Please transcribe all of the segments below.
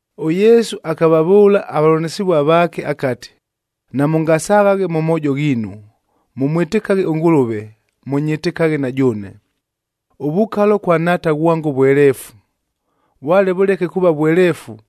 ɄYesu akavavʉʉla avavʉlanɨsɨvua vaake akati, “Namʉngasaghaghe mʉ moojo ghiinu. Mʉmwɨtɨkaghe ʉNgʉlʉve, mʉnyɨtɨkaghe na jʉʉne. Ʉvukalo kwa Nhaata ghwango vweleefu, vwale vʉleke kuuva vweleefu,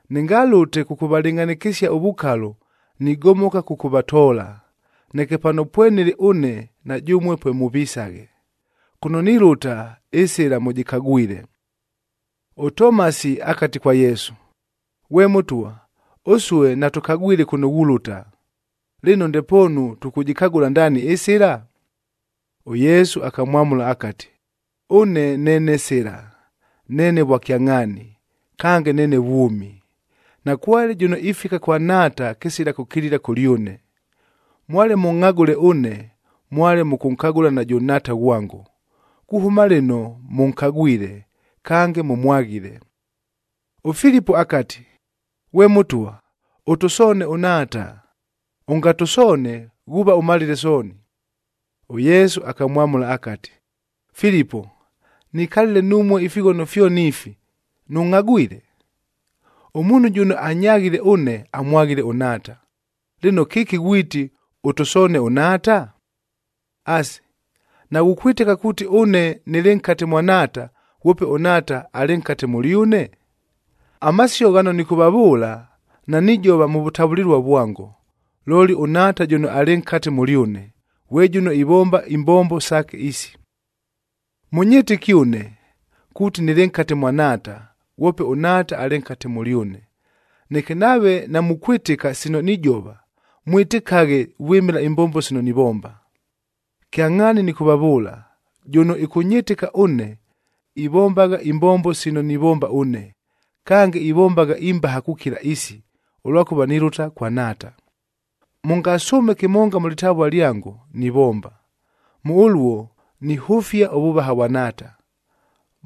Nɨngalʉte kʉkʉvalɨngʼhanɨkɨsia ʉvukalo, nigomoka kʉkʉvatoola, neke pano pwenɨlɨ ʉne na jʉmue pwemʉvisaghe. Kʉno nilʉta, ɨsɨla mʉjɨkagwile.” ɄTomasi akati kwa Yesu, “Ghwe Mʉtwa, ʉsue natʉkagwile kʉno ghulʉta. Lɨno, ndepoonu tʉkʉjɨkagʉla ndaani ɨsɨla?” ɄYesu akamwamʉla akati, “Ʉne neene sɨla, neene vwakyangʼhaani, kange neene vwʉmi. Nakwale jʉno ifika kwa Nhaata kɨsila kʉkilila kʉlyʉne. Mwale mʉngʼhagʉle ʉne, mwale mʉkʉnkagʉla najʉ Nhaata ghwango. Kuhʉma lɨno, mʉnkagwile, kange mʉmwaghile.” ɄFilipo akati, “Ghwe Mʉtwa, ʉtʉsoone ʉNhaata. Ʉngatʉsoone ghuuva ʉmalile sooni.” ɄYesu akamwamʉla akati, “Filipo, nikalile numue ifighono fyoni ifi, nʉngʼhagwile? Ʉmuunhu jʉno anyaghile ʉne, amwaghile ʉNhaata. Lɨno kɨki ghwiti, ‘Ʉtʉsoone ʉNhaata’? Asi, naghukwɨtɨka kuuti ʉne nɨlɨ nkate mwa Nhaata, ghwope ʉNhaata alɨ nkate mʉlyʉne? Amasio ghano nɨkʉvavʉʉla, nanijova mʉ vʉtavʉlɨlua vwango, looli ʉNhaata jʉno alɨ nkate mʉlyʉne, ghwe jʉno ivomba imbombo saake isi. “Mʉnyɨtɨke ʉne, kuuti nɨlɨ nkate mwa Nhaata, ghwope ʉNhaata alɨ nkate mʉlyʉne. Neke nave namukwɨtɨka sino nijova, mwɨtɨkaghe vwɨmɨla imbombo sino nivomba. Kyangʼhaani nɨkʉvavʉʉla, jʉno ɨkʉnyɨtɨka ʉne, ivombagha imbombo sino nivomba ʉne. Kange, ivombagha imbaha kukila isi, ʉlwakʉva nilʉta kwa Nhaata. Mʉngasʉʉme kɨmonga mʉ lɨtavua lyango, nivomba. Mʉ ʉluo, nihʉfia ʉvʉvaha vwa Nhaata.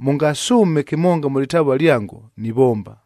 Mʉngasʉʉme kɨmonga mʉ lɨtavua lyango, nivomba.”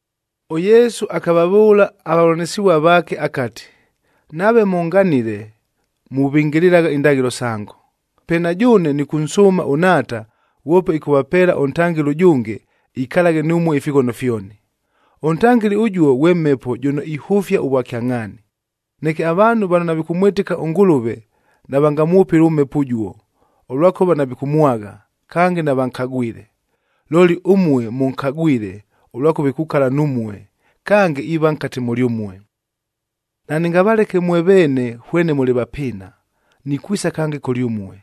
ɄYesu akavavʉʉla avavʉlanɨsɨvua vaake akati, “Nave mʉnganile, muvɨngɨlɨlagha indaghɨlo sango. Pe na jʉʉne nɨkʉnsʉʉma ʉNhaata, ghwope ɨkʉvapeela ʉNtangɨli ʉjʉnge, ikalaghe numue ifighono fyoni. ɄNtangɨli ʉjuo ghwe Mhepo jʉno ihʉfia ʉvwakyangʼhaani. Neke avaanhu vano navikʉmwɨtɨka ʉNgʉlʉve navangamwʉpɨle ʉMhepo ʉjuo, ʉlwakʉva navikʉmwagha, kange navankagwile. Looli ʉmue mʉnkagwile ʉlwakʉva ikukala numue, kange iiva nkate mʉlyʉmue. “Nanɨngavaleke mwe veene hwene mʉlɨ vapɨɨna, nikwisa kange kʉlyʉmue.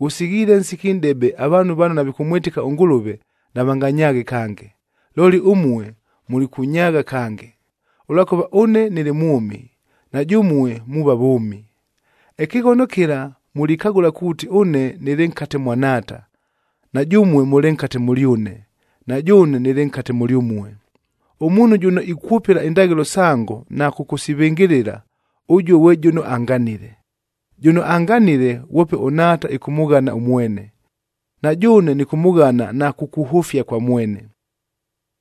Ghʉsighiile ʉnsiki nʼdebe avaanhu vano navikʉmwɨtɨka ʉNgʉlʉve, navanganyaaghe kange. Looli ʉmue mulikʉnyaagha kange. Ʉlwakʉva ʉne nɨlɨ mwʉmi, na jʉmue muuva vʉʉmi. Ɨkɨghono kɨla mulikagʉla kuuti ʉne nɨlɨ nkate mwa Nhaata, na jʉmue mʉlɨ nkate mʉlyʉne, na jʉʉne nɨlɨ nkate mʉlyʉmue. Ʉmuunhu jʉno ikwʉpɨla indaghɨlo sango na kʉkʉsivɨngɨlɨla, ʉjuo ghwe jʉno anganile. Jʉno anganile, ghwope ʉNhaata ɨkʉmʉghana ʉmwene. Na jʉʉne nɨkʉmʉghana na kukuhʉfia kwa mwene.”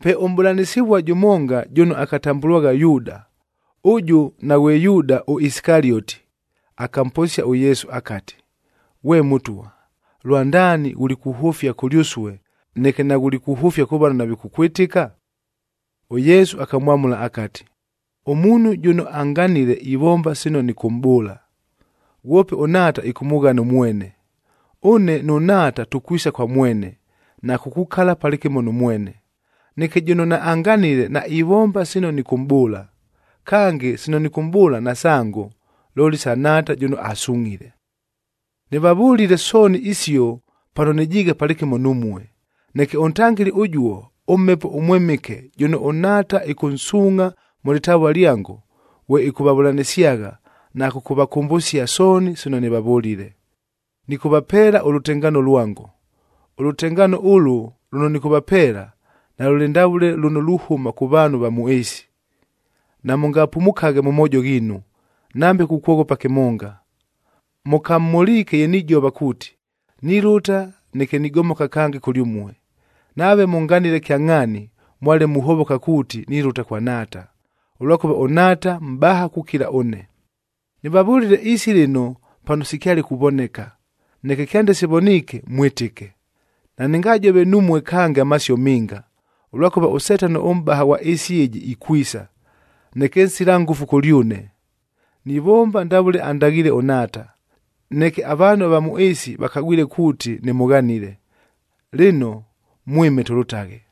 Pe ʉmʼbʉlanɨsɨvua jʉmonga jʉno akatambʉlwagha Yuuda, ʉjʉ naghwe Yuuda ʉIsikalioti, akamposia ʉYesu akati, “Ghwe Mʉtwa, lwandaani ghulikuhʉfia kʉlyʉsue, neke naghulikuhʉfia kʉ vano navikʉkwɨtɨka?” ɄYesu akamwamʉla akati, “Ʉmuunhu jʉno anganile ivomba sino nɨkʉmʼbʉʉla, ghwope ʉNhaata ɨkʉmʉghana ʉmwene. Ʉne nʉ Nhaata tukwisa kwa mwene, na kukukala palɨkɨmo nʉ mwene. Neke jʉno naanganile, naivomba sino nɨkʉmʼbʉʉla. Kange, sino nɨkʉmʼbʉʉla nasango, looli sa Nhaata jʉno asungʼhile. “Nɨvavʉlile sooni isio pano nɨjiighe palɨkɨmo numue, neke ʉNtangɨli ʉjuo, ʉMhepo ʉMwɨmɨke jʉno ʉNhaata ɨkʉnsuungʼha mʉ lɨtavua lyango, ghwe ɨkʉvavʉlanɨsyagha na kʉkʉvakʉmbʉsia sooni sino nɨvavʉlile. Nɨkʉvapeela ʉlʉtengaano lwango. Ʉlʉtengaano ʉlʉ lʉno nɨkʉvapeela, nalʉlɨ ndavʉle lʉno luhʉma kʉ vaanhu ava mʉ ɨɨsi. Namʉngapumukaghe mʉ moojo ghiinu, nambe kukwoghopa kɨmonga. Mʉkamhʉliike ye nijova kuuti, ‘Nilʉta, neke nigomoka kange kʉlyʉmue.’ Nave mʉnganile kyangʼhaani, mwale muhovoka kuuti nilʉta kwa Nhaata, ʉlwakʉva ʉNhaata mʼbaha kukila ʉne. “Nɨvavʉlile isi lɨno pano sikyale kuvoneka, neke kyande sivoniike, mwɨtɨke. Nanɨngajove numue kange amasio minga, ʉlwakʉva ʉSetano ʉmʼbaha ghwa ɨɨsi ɨjɨ ikwisa. Neke nsila ngʉfu kʉlyʉne. Nivomba ndavʉle andaghiile ʉNhaata, neke avaanhu ava mʉ ɨɨsi vakagʉle kuuti nɨmʉghanile. Lɨno, mwɨme tʉlʉtaghe.”